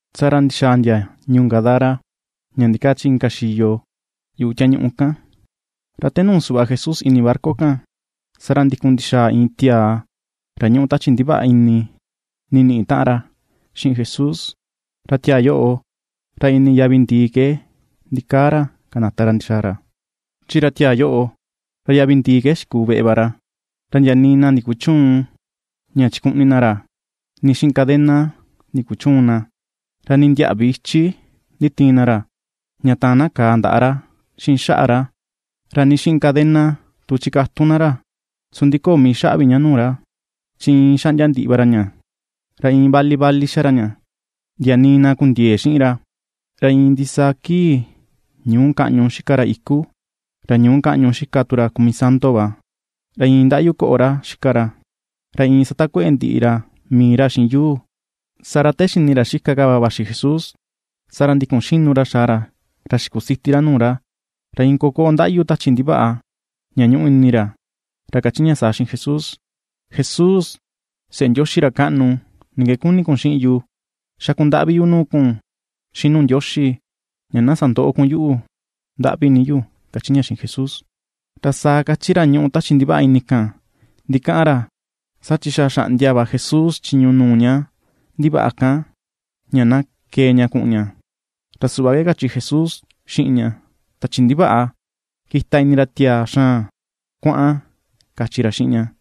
Saa ra ndixaa ndia ñuu Gadara, ña ndikaa chi inka xiyo yuꞌu tiañuꞌu kan. Ra te nuu suꞌva Jesús ini barca kan, saa ra ndikun ndixaa iin tiaa ra ñuꞌu tachi ndivaꞌa ini, niniꞌi taꞌan ra xiꞌin Jesús, ra tiaa yoꞌo ra ini yavi ndìì ke ndikaa ra, kanata ra ndixaa ra. Chi ra tiaa yoꞌo, ra yavi ndìì ke xikuu veꞌe va ra. Ra ndia nii na taꞌan ra ndikuchüun ña chikuꞌni na ra, nii xiꞌin cadena ndikuchüun na. Ra nii ndiäꞌvi ichi nditiin na ra, ña taan na kàà ndaꞌa ra xiꞌin xaꞌa ra, ra nii xiꞌin cadena tu chikatun na ra, su ndi köo mii xaꞌa vi ña nuu ra, chi iin xaꞌndia ndiꞌi va ra ña, ra iin vali vali xa ra ña, ndia nii na kundiëe xiꞌin ra. Ra iin ndisaa kii, ñuu kaꞌñu xika ra iku, ra ñuu kaꞌñu xika tu ra kumisanto va, ra iin ndaꞌyu koꞌo ra xika ra, ra iin satakueꞌe ndiꞌi ra mii ra xiꞌin yuu. Saa ra te xini ra xika ka va vaxi Jesús, saa ra ndikun xinu ra xaa ra xikusiti ra nuu ra. Ra iin kokoꞌo ndaꞌyu tachi ndivaꞌa ña ñuꞌu ini ra, ra kachi ña saa xiꞌin Jesús: ―¡Jesús, Seꞌe Ndioxi ra kaꞌnu! ¿Ni ke kuni kun xiꞌin yu? Xakundaꞌvi yu nuu kun xiꞌin nuu Ndioxi, ña na sandöꞌo kun yuꞌu. ¡Ndaꞌvi ni yu! ―kachi ña xiꞌin Jesús. Ra saa kachi ra ñuꞌu tachi ndivaꞌa ini kan ndikaꞌan ra, saa chi xa xaꞌndia va Jesús chiñu nuu ña ndivaꞌa kan ña na kee ña kuꞌun ña, ra suꞌva ke kachi Jesús xiꞌin ña: ―¡Tachi ndivaꞌa, kita ini ra tiaa xaan! ¡Kuaꞌan! ―kachi ra xiꞌin ña.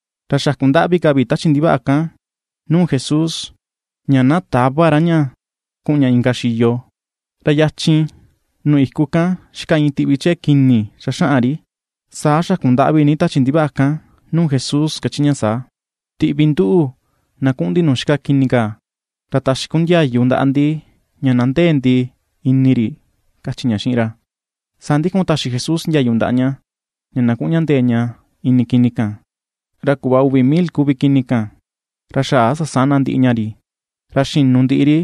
Ra xakundaꞌvi ka vi tachi ndivaꞌa kan nuu Jesús ña na täva ra ña kuꞌun ña inka xiyo. Ra yachin nuu iku kan xika iin tiꞌvi chee kini xaxaꞌan ri. Saa xakundaꞌvi ni tachi ndivaꞌa kan nuu Jesús kachi ña saa: ―Tiꞌvi nduꞌu na kuꞌun ndi nuu xika kini kaa, ra taxi kun ndiayu ndaꞌa ndi ña na ndee ndi ini ri ―kachi ña xiꞌin ra. Saa ndikun taxi Jesús ndiayu ndaꞌa ña, ña na kuꞌun ña ndee ña ini kini kan, ra kuꞌva uvi mil kuvi kini kan. Ra xaꞌa sasana ndiꞌi ña ri, ra xinu ndiꞌi ri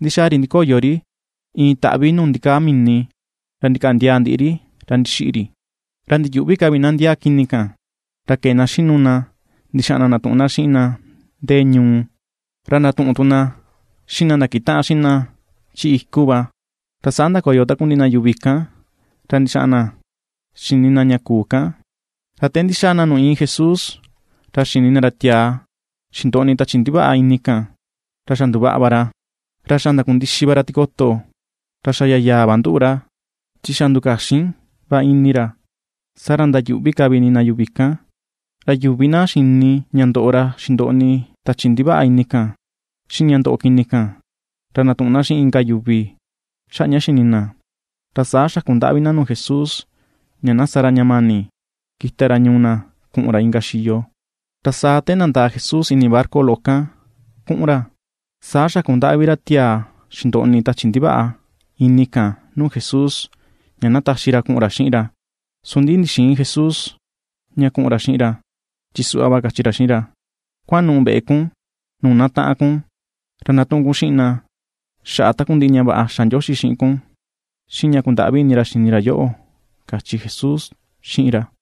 ndi̱xàà ri ndikoyo ri iin taꞌvi nuu ndikaa mini, ra ndikaꞌa ndiaa ndiꞌi ri, ra ndixiꞌi ri. Ra ndiyuꞌvi ka vi na ndiaa kini kan, ra kee na xinu na ndixaꞌan na ndatuꞌun na xiꞌin na ndee ñuu, ra ndatuꞌun tu na xiꞌin na ndakitaꞌan xiꞌin na chi iku va. Ra saa ndakoyo takundiꞌi na yuvi kan ra ndi̱xa̱a̱ na xini na ña kuu kan. Ra te ndi̱xa̱a̱ na nuu iin Jesús, ra xini na ra tiaa xindoꞌni tachi ndivaꞌa ini kan, ra xa nduvaꞌa va ra, ra xa ndakundixi va ra tikoto, ra xa yayaa va nduꞌu ra, chi xa ndukaxin va ini ra. Saa ra ndayuꞌvi ka vi ini na yuvi kan. Ra yuvi na xini ña ndoꞌo ra xindoꞌni tachi ndivaꞌa ini kan, xiꞌin ña ndoꞌo kini kan, ra ndatuꞌun na xiꞌin inka yuvi xaꞌa ña xini na. Ra saa xakundaꞌvi na nuu Jesús ña na sa ra ña mani kita ra ñuu na kuꞌun ra inka xiyo. Ra saa te nandaa Jesús ini barca loꞌo kan kuꞌun ra, saa xakundaꞌvi ra tiaa xindoꞌni tachi ndivaꞌa ini kan nuu Jesús ña na taxi ra kuꞌun ra xiꞌin ra. Su ndi ndixïin Jesús ña kuꞌun ra xiꞌin ra, chi suꞌva va kachi ra xiꞌin ra: Kuanuꞌu̱ veꞌe kun nuu na taꞌan kun, ra ndatuꞌun kun xiꞌin na xaꞌa takundiꞌi ña vaꞌa xa Ndioxi xiꞌin kun, xiꞌin ña kundaꞌvi ini ra xini ra yoꞌo ―kachi Jesús xiꞌin ra.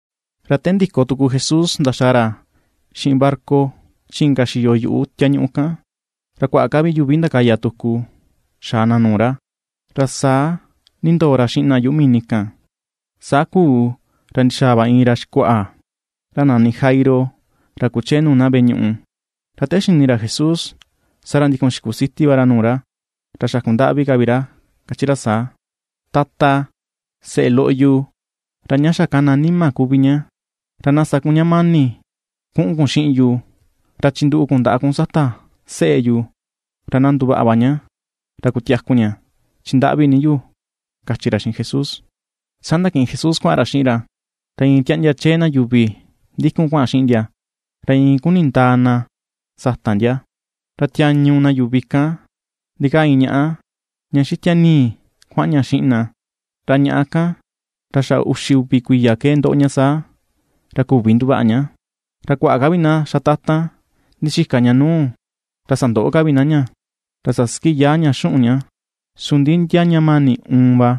Ra te ndiko tuku Jesús ndaxàà ra xiꞌin barca chi inka xiyo yuꞌu tiañuꞌu kan, ra kuaꞌa ka vi yuvi ndakaya tuku xaa na nuu ra; ra saa nindoo ra xiꞌin na yuꞌu mini kan. Saa kuu ra ndixaa va iin ra xikuaꞌa, ra nani Jairo, ra kuchee nuu na veꞌe ñuꞌu, ra te xini ra Jesús, saa ra ndikun xikusiti va ra nuu ra, ra xakundaꞌvi ka vi ra kachi ra saa: ―Tata, seꞌe loꞌo yu ra ña xa kana nima kuvi ña, ra na sa kun ña mani kuꞌun kun xiꞌin yu ra chinduꞌu kun ndaꞌa kun sata seꞌe yu, ra na nduvaꞌa va ña ra kutiaku ña. Chi ndaꞌvi ni yu ―kachi ra xiꞌin Jesús. Saa ndakiꞌin Jesús kuaꞌan ra xiꞌin ra. Ra iin tiaꞌndia chee na yuvi ndikun kuaꞌan xiꞌin ndia, ra iin kuni̱ ndaa na sata ndia. Ra tiañu na yuvi kan, ndikaa iin ñaꞌá ña xitia ni̱i̱ kuaꞌan ña xiꞌin na, ra ñaꞌá kan ra xa uxi uvi kuiya ke ndoꞌo ña saa, ra küvi nduvaꞌa ña. Ra kuaꞌa ka vi na xatatan ndixika ña nuu, ra sandoꞌo ka vi na ña, ra sasiki yaa ña xuꞌun ña, su ndi ndia ña mani uun va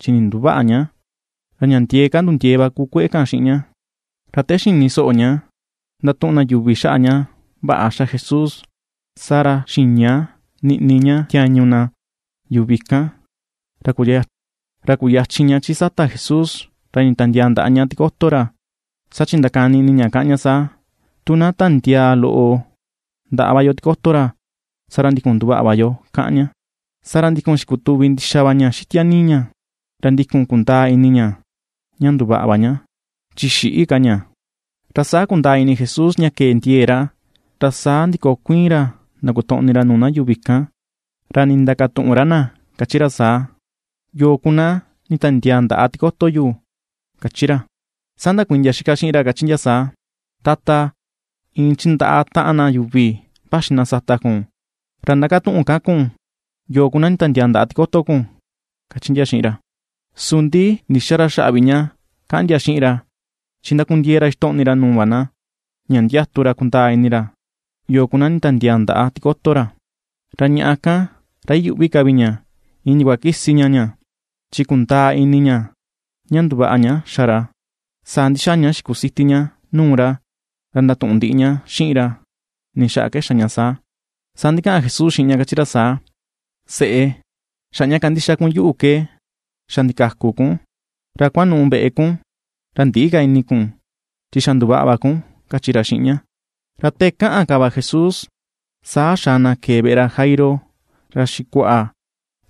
chi ninduväꞌa ña, ra ña ndiee ka nundiee va ku kueꞌe kan xiꞌin ña. Ra te xini soꞌo ña ndatuꞌun na yuvi xaꞌa ña vaꞌa xa Jesús, saa ra xiña niꞌni, ña tiañu na yuvi kan, ra kuyachin ña chi sata Jesús, ra nditiandiaa ndaꞌa ña tikoto ra. Saa chi ndakani ini ña kaꞌan ña saa: “Tu na tiandiaa loꞌo ndaꞌa va yo tikoto ra, saa ra ndikun nduvaꞌa va yo”, kaꞌan ña. Saa ra ndikun xikutuvi ndixa va ña xitia ni̱i̱ ña, ra ndikun kundaa ini ña ña nduvaꞌa va ña, chi xïꞌi ka ña. Ra saa kundaa ini Jesús ña ke̱e ndie̱e̱ ra, ra saa ndikokuiin ra ndakotoꞌni ra nuu na yuvi kan, ra ndindakatuꞌun ra na, kachi ra saa: ―¿Yoo ku na nditiandiaa ndaꞌa tikoto yu? ―kachi ra. Saa ndakuiin ndia itaꞌan xiꞌin ra, kachi ndia saa: ―Tata, iin chindaꞌa taꞌan na yuvi vaxi na sata kun, ra ^ndakatuꞌun ka kun, yo ku na nditiandiaa ndaꞌa tikoto kun ―kachi ndia xiꞌin ra. Su ndi ndïxa ra xaꞌa vi ña kaꞌan ndia xiꞌin ra, chi ndakundiee ra ixtoꞌni ra nuu va na, ña ndiatu ra kundaa ini ra, yo ku na nditiandiaa ndaꞌa tikoto ra. Ra ñaꞌa kan ra iyuꞌvi ka vi ña, iin ndiakua kisi ña ña, chi kundaa ini ña ña nduvaꞌa ña xa ra. Saa ndixaa ña xikusiti ña nuu ra, ra ndatuꞌun ndiꞌi ña xiꞌin ra, ni xaꞌa ke xa ña saa. Saa ndikaꞌan Jesús xiꞌin ña kachi ra saa: ―Seꞌe, xaꞌa ña kandixa kun yuꞌu ke xa ndikaku kun. Ra kuanuꞌu veꞌe kun, ra ndïꞌi ka ini kun, chi xa nduvaꞌa va kun ―kachi ra xiꞌin ña. Ra te kaꞌan ka va Jesús, saa xaa na kee veꞌe ra Jairo, ra xikuaꞌa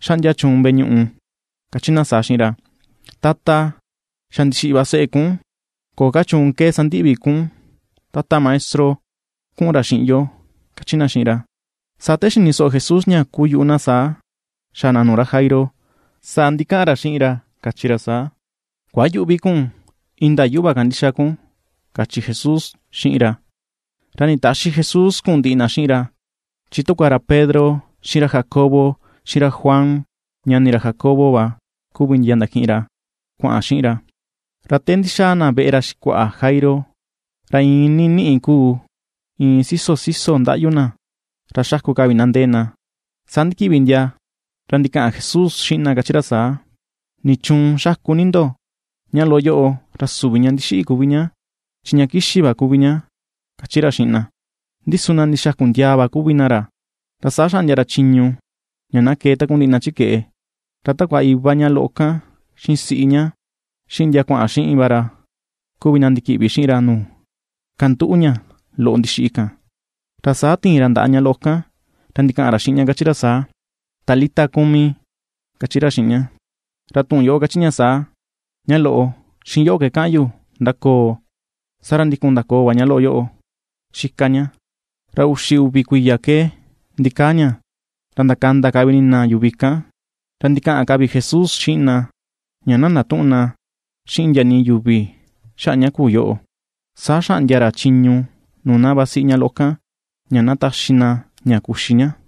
xaꞌndia chuun veꞌe ñuꞌu, kachi na saa xiꞌin ra: ―Tata, xa ndixiꞌi va seꞌe kun. Köo ka chuun ke sandiꞌi vi kun tata maestro kuꞌun ra xiꞌin yo ―kachi na xiꞌin ra. Saa te xini soꞌo Jesús ña kuyuꞌu na saa xaa na nuu ra Jairo, saa ndikaꞌan ra xiꞌin ra kachi ra saa: ―Kuayüꞌvi kun, indaa yuꞌu va kandixa kun ―kachi Jesús xiꞌin ra. Ra nditäxi Jesús kuꞌun ndiꞌi na xiꞌin ra, chi takua ra Pedro, xiꞌin ra Jacobo, xiꞌin ra Juan ñani ra Jacobo va kuvi ndia ndakiꞌin ra kuaꞌan xiꞌin ra. Ra te ndixaa ra veꞌe ra xikuaꞌa Jairo, ra iin niniꞌi kuu, iin siso siso ndaꞌyu na, ra xaku ka vi na ndee na. Saa ndikiꞌvi ndia ra ndikaꞌan Jesús xiꞌin na kachi ra saa: ―¿Nichuun xaku ni ndo? Ña loꞌo yoꞌo ra süvi ña ndixiꞌi kuvi ña, chi ña kixi va kuvi ña ―kachi ra xiꞌin na. Ndi su na ndixaku ndiaa va kuvi na ra. Ra saa xaꞌndia ra chiñu ña na kee takundiꞌi na chi keꞌe, ra takua iva ña loꞌo kan xiꞌin siꞌi ña, xiꞌin ndia kuaꞌan xiꞌin va ra kuvi na ndikiꞌvi xiꞌin ra nuu kanduꞌu ña loꞌo ndixiꞌi kan. Ra saa tiin ra ndaꞌa ña loꞌo kan, ra ndikaꞌan ra xiꞌin ña kachi ra saa: ―Talita kumi ―kachi ra xiꞌin ña; ra tuꞌun yoꞌo kachi ña saa: “Ña loꞌo, xiꞌin yoꞌo ke kaꞌan yu, ndakoo”. Saa ra ndikun ndakoò va ña loꞌo yoꞌo xika ña, ra uxi uvi va kuiya ke ndikaa ña, ra ndakanda ka vi ini na yuvi kan. Ra ndikaꞌan ka vi Jesús xiꞌin na, ña na ndatüꞌun na xiꞌin ndia nii yuvi xaꞌa ña kuu yoꞌo. Saa xaꞌndia ra chiñu nuu na vasiꞌi ña loꞌo kan, ña na taxi na ña kuxi ña.